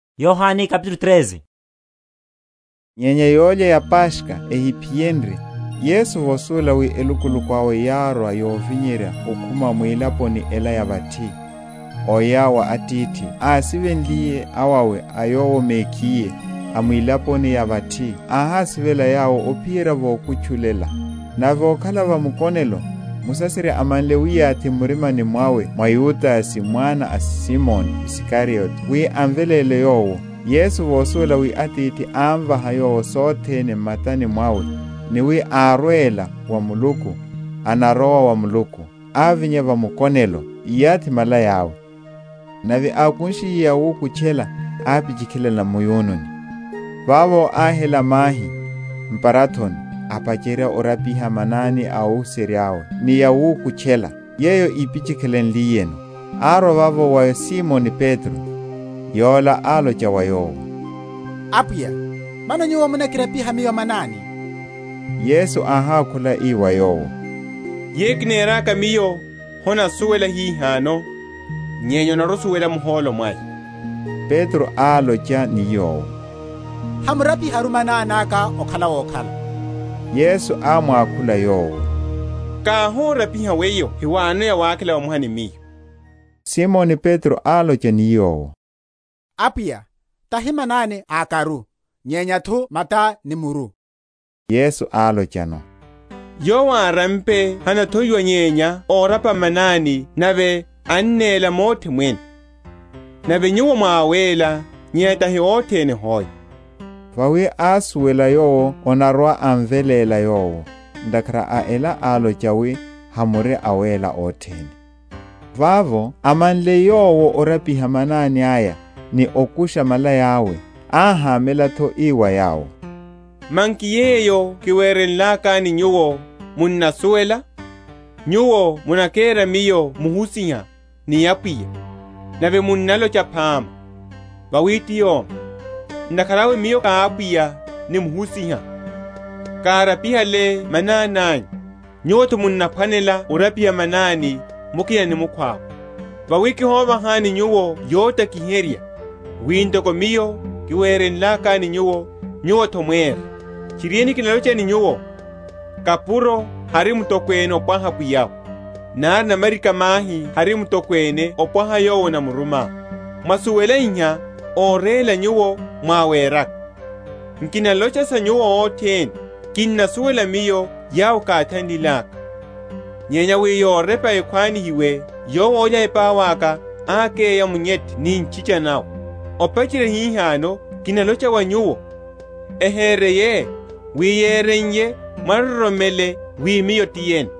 Orapiha wa manani a óhuserya’we. Nyenya yólya ya Paskha ehiphiyenrye, Yesu, vosuwela wi elukuluku awe yárwa yovinyerya okhuma mwilaponi ela ya vathi, oya wa Atithi, ásivenliye awawe a Yowo mekhiye a mwilaponi ya vathi, áhásivela yawo ophiyerya vokutchulela. Nave vokhala va mukonelo, Musaserya amanle wiyathi m’murimani mwawe mwa Yudase mwana a Simoni Isikariote, wi amveléle Yowo, Yesu, vosuwela wi Atithi ámvaha Yowo sothene m’matani mwawe, ni wi árwela wa Muluku, anarowa wa Muluku, ávinya va mukonelo, íyathi malaya’we; nave ákunshiye yawukutchela, ápichikhilela mu’yununi. Vavo áhela mahi m’parathoni, apacherya orapiha manani a óhuserya’we, ni wukutcha ni yawukutchela, yeyo ípichikhilenliyeno. Árwa vavo wa Simoni Petro. Yola álocha wa Yowo, Apwiya, Mano Nyuwo munakirapiha miyo manani? Yesu áhákhula ii wa yowo, Yeyo kineraka Miyo, honasuwela hihano; nyenya onarwa‐osuwela muhólo mwaya. Petro álocha ni Yowo, Hamurapiharu manani aka okhala wokhala. Yesu ámwakhula yowo, Káhorapiha weyo hewanono yawakhela vamoha ni Miyo. Simoni Petro álocha ni Yowo, Apwiya, tahi manani akaru, nyenya’tho mata ni muru. Yesu álochano, Yowo árampe hanathowiwa nyenya orapa manani, nave annéla mothe mwene: nave nyuwo mwá awéla, nyenya tahi othene hoe. Vawi ásuwela yowo anarwa‐amveléla Yowo; ntakhara a ela álocha, wi, Hamuri awéla othene. Vavo, amanle Yowo orapiha manani aya, ni okusha malaya’we, áhámela’tho, ii wa yawo, Manki yeyo kiwerenlakani nyuwo, munnasuwela? Nyuwo munakera Miyo Muhusiha, ni Apwiya: nave munnalocha phama; vawi ti yomi. Ntakhara awe, Miyo Apwiya, ni Muhusiha, kárapihale manani anyu, nyuwo’tho munaphwanela orapihana manani mukina ni mukhwawe. Vawi kihovahani nyuwo yotakiherya, wi, ntoko Miyo kiwerenlakani nyuwo, nyuwo’tho mwére. Tchiriene, kinalocha ni nyuwo, kapuro hari mutokwene ompwaha pwiya’we; nari namarika‐mahi hari mutokwene ompwaha yowo anamuruma. Mwasuwela iha, óréla nyuwo mwáweraka. Nkinalocha sa nyuwo othene: kinnasuwela Miyo yawo káthanlilaka: nyenya wi yorepa ekhwanihiwe, Yowo ólya epau aka ákeya munyethe ni ntchicha nawe. Opacherya hihano kinalocha wa nyuwo, ehereiye, wi yereiye, mwaroromele wi Miyo ti yene.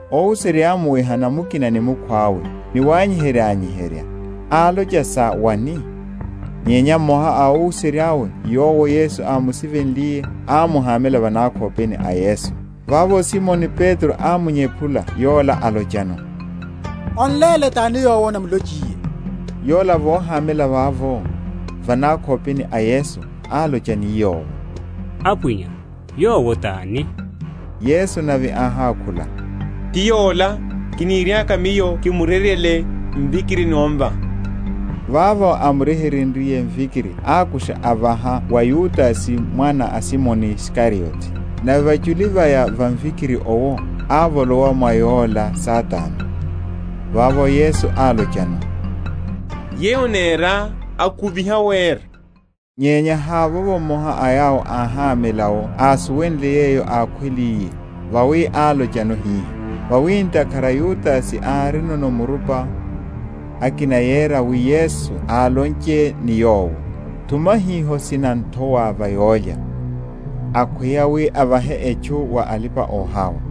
Óhuserya yámuwehana mukina ni mukhwawe, ni wanyiherya?-?anyiherya álocha sa wani? Nyenya mmoha a óhuserya’we yowo Yesu ámusivenliye ámuhámela va nákhopeni a Yesu. Vavo Simoni Petro ámunyephula yola álochano, On’léle tani yowo anamulochiye. Yola vohámela vavo, va nákhopeni a Yesu, álocha ni Yowo, Apwiya, yowo tani? Yesu nave áhákhula, Ti yola, kiniriaka Miyo kimuryeryele mvikiri ni omvaha. Vavo, ámuryeryenliye mvikiri ákusha avaha wa Yudase mwana a Simoni Isikariote. Nave vachuli vaya va mvikiri owo, ávolowa mwa yola Satana. Vavo Yesu álochano, Yeyo onéra, akuviha wera. Nyenya havovo mmoha a yawo óhámela’wo ásuwenle yeyo ákhweliye, vawi álochano hiha. Vawi ntakhara Yudase árino murupa, akina yera wi Yesu álonche ni yowo, Thuma hiho sinan’thowa va yólya; akhweya, wi avahe etchu wa alipa‐ohawa.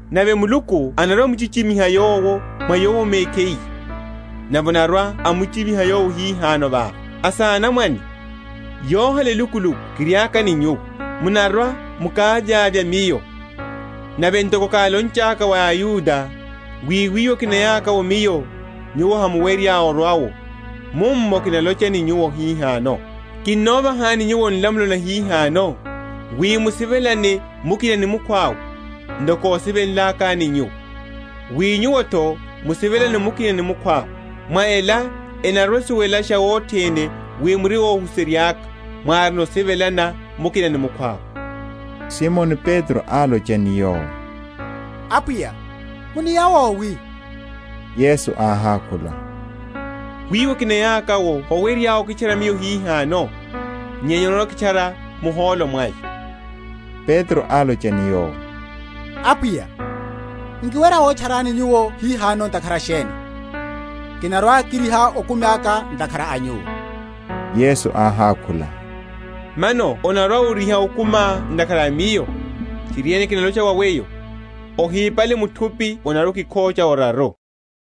nave Muluku anarwa‐amuchichimiha Yowo mwa Yowo mekhiye, nave anarwa‐amuchichimiha Yowo hihano vava. Asanamwane, yohala elukuluku kiriaka ni nyuwo. Munarwa‐mukavyavya Miyo: nave ntoko kálonchaka wa aYuda, wi wiwo kinayaka’wo Miyo, nyuwo hamuwerya orwa’wo, mummo kinalocha ni nyuwo hihano. Kinovahani nyuwo nlamulo nahihano, wi musivelane mukina ni mukhwawe; ntoko kósivenlakani nyuwo, wi nyuwo’tho musivelane mukina ni mukhwawe. Mwa ela enarwa‐esuwelasha othene wi muri óhuserya’ka, mwárino osivelana mukina ni mukhwawe. Simoni Petro álocha ni Yowo, Apwiya, Muniya wowi? Yesu áhákhula, Wiwo kiniyaka’wo howerya okitchara Miyo hihano; nyenya onarwa‐okitchara muhólo mwaya. Petro álocha ni Yowo, Apwiya, nkiwerya wotcharani Nyuwo hihano ntakhara sheni? Kinarwa‐kiriha okumi aka ntakhara a Nyuwo. Yesu áhákhula, Mano onarwa‐oriha okumiá ntakhara a Miyo? Tchiriene, kinalocha wa weyo, ohípale muthupi onarwa‐okikhocha oraru.